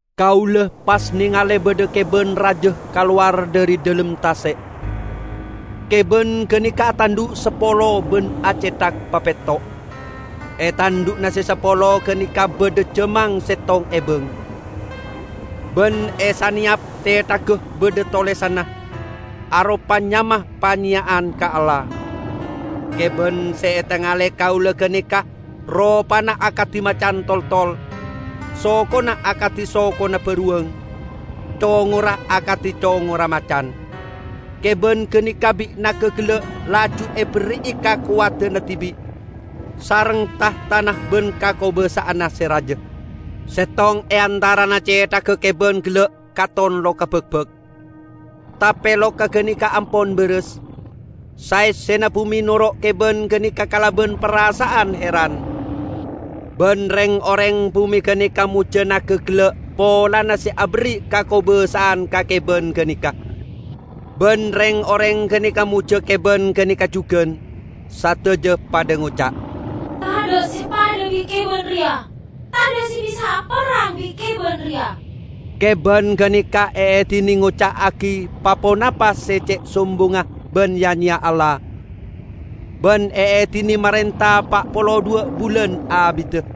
Kaula pas nengale badha keban raja kalowar dhari dhalem tase'. Keban ganeka atandhu' sapolo ban acethak papetto'. E tandhu'na se sapolo ganeka badha jamang settong ebang, ban e saneyap cethagga badha tolesanna, aropa nyama panyeya'an ka Allah. Keban se etengale kaula ganeka ropana akadi macan toltol, sokona akadi sokona baruwang, congorra akadi congorra macan. Keban ganeka bi' naga gella' laju eberri'i kakowadanna dibi', sareng tahtana ban kakobasa'anna se raja. Settong e antarana cethagga keban gella' katon loka bakbak, tape loka ganeka ampon baras. Saessena bume noro' keban ganeka kalaban parasa'an heran. Ban reng-oreng bume ganeka mojja naga gella' polana se aberri' kakobasa'an ka keban ganeka. Ban reng-oreng ganeka mojja keban ganeka jugan. Sadaja padha ngoca', "Tadha' se padha bi' keban reya! Tadha' se bisa aperrang bi' keban reya!" Keban ganeka eedine ngoca'agi pa-ponapa se ce' sombongnga ban ya-nyeya Allah, ban eedine marenta pa' polo dhuwa' bulan abidda.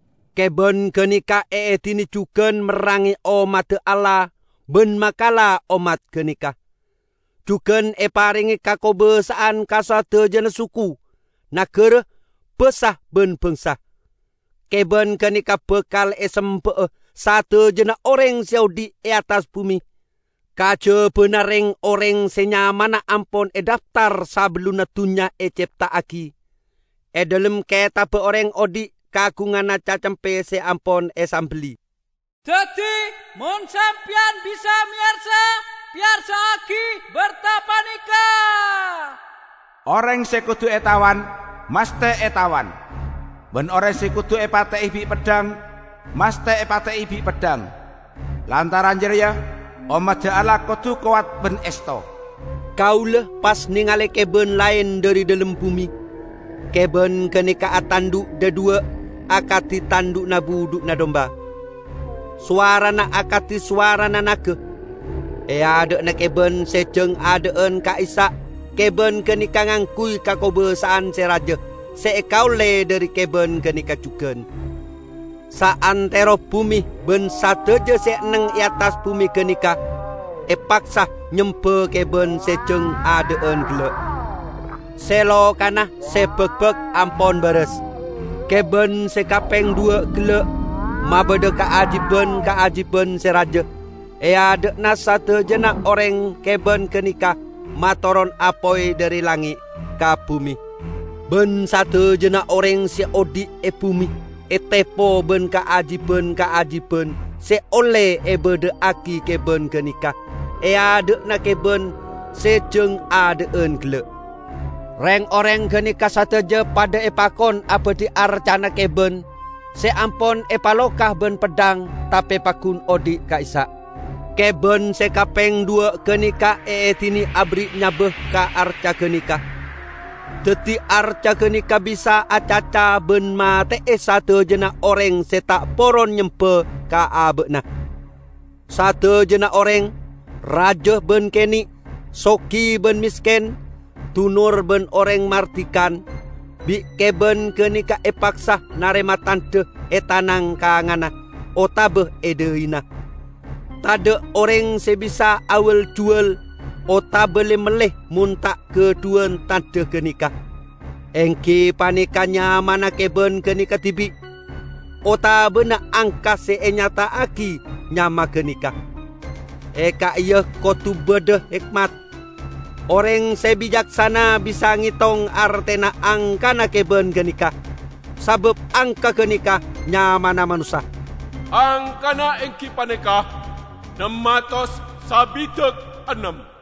Keban ganeka eedine jugan merrange ommadda Allah ban makala ommat ganeka. Jugan eparenge kakobasa'an ka sadajana suku, nagara, basa ban bangsa. Keban ganeka bakal esemba'a sadajana oreng se odhi' e attas bume, kajabana reng-oreng se nyamana ampon edhaftar sabellunna dunnya ecepta'agi, e dhalem ketabba oreng odhi' kaagunganna Cacempe se ampon esambelli. Daddi, mon sampeyan bisa meyarsa, peyarsa'agi berta paneka: "Oreng se kodu etawan, masthe etawan. Ban oreng se kodu epate'e bi' peddhang, masthe epate'e bi' peddhang. Lantaran jareya, ommadda Allah kodu kowat ban esto." Kaula pas nengale keban laen dhari dhalem bume. Keban ganeka atandhu' dhadhuwa' akadi tandhu'na budhu'na dumba. Sowarana akadi sowarana naga. E adha'na keban se jang adha'an ka'issa' keban ganeka ngangguy kakobasa'an se raja se ekaolle dhari keban ganeka jugan. Saantero bume ban sadaja se enneng e attas bume ganeka, epaksa nyemba keban se jang adha'an gella', se lokana se bakbak ampon baras. Keban se kapeng dhuwa' gella' mabadha kaajiban-kaajiban se raja. E adha'na sadajana oreng keban ganeka matoron apoy dhari langnge' ka bume. Ban sadajana oreng se odhi' e bume etepo ban kaajiban-kaajiban se olle ebadha'agi keban ganeka e adha'na keban se jang adha'an gella'. Reng-oreng ganeka sadaja padha epakon abadhi arcana keban se ampon epaloka ban peddhang tape paggun odhi' ka'issa'. Keban se kapeng dhuwa' ganeka eedine aberri' nyaba ka arca ganeka, daddi arca ganeka bisa acaca ban mate'e sadajana oreng se ta' poron nyemba ka aba'na. Sadajana oreng, raja ban kene', sogi ban mesken, dunor ban oreng mardikan, bi' keban ganeka epaksa narema tandha e tanang kanganna otaba e dhaina. Tadha' oreng se bisa awal-juwal otaba le-melle mon ta' gadhuwan tandha ganeka, enggi paneka nyamana keban ganeka dibi', otabana angka se anyata'agi nyama ganeka. E ka'iya kodu badha hekmat. Oreng se bicaksana bisa ngetong artena angkana keban ganeka, sabab angka ganeka nyamana manossa. Angkana enggi paneka nem atos sabidak ennem.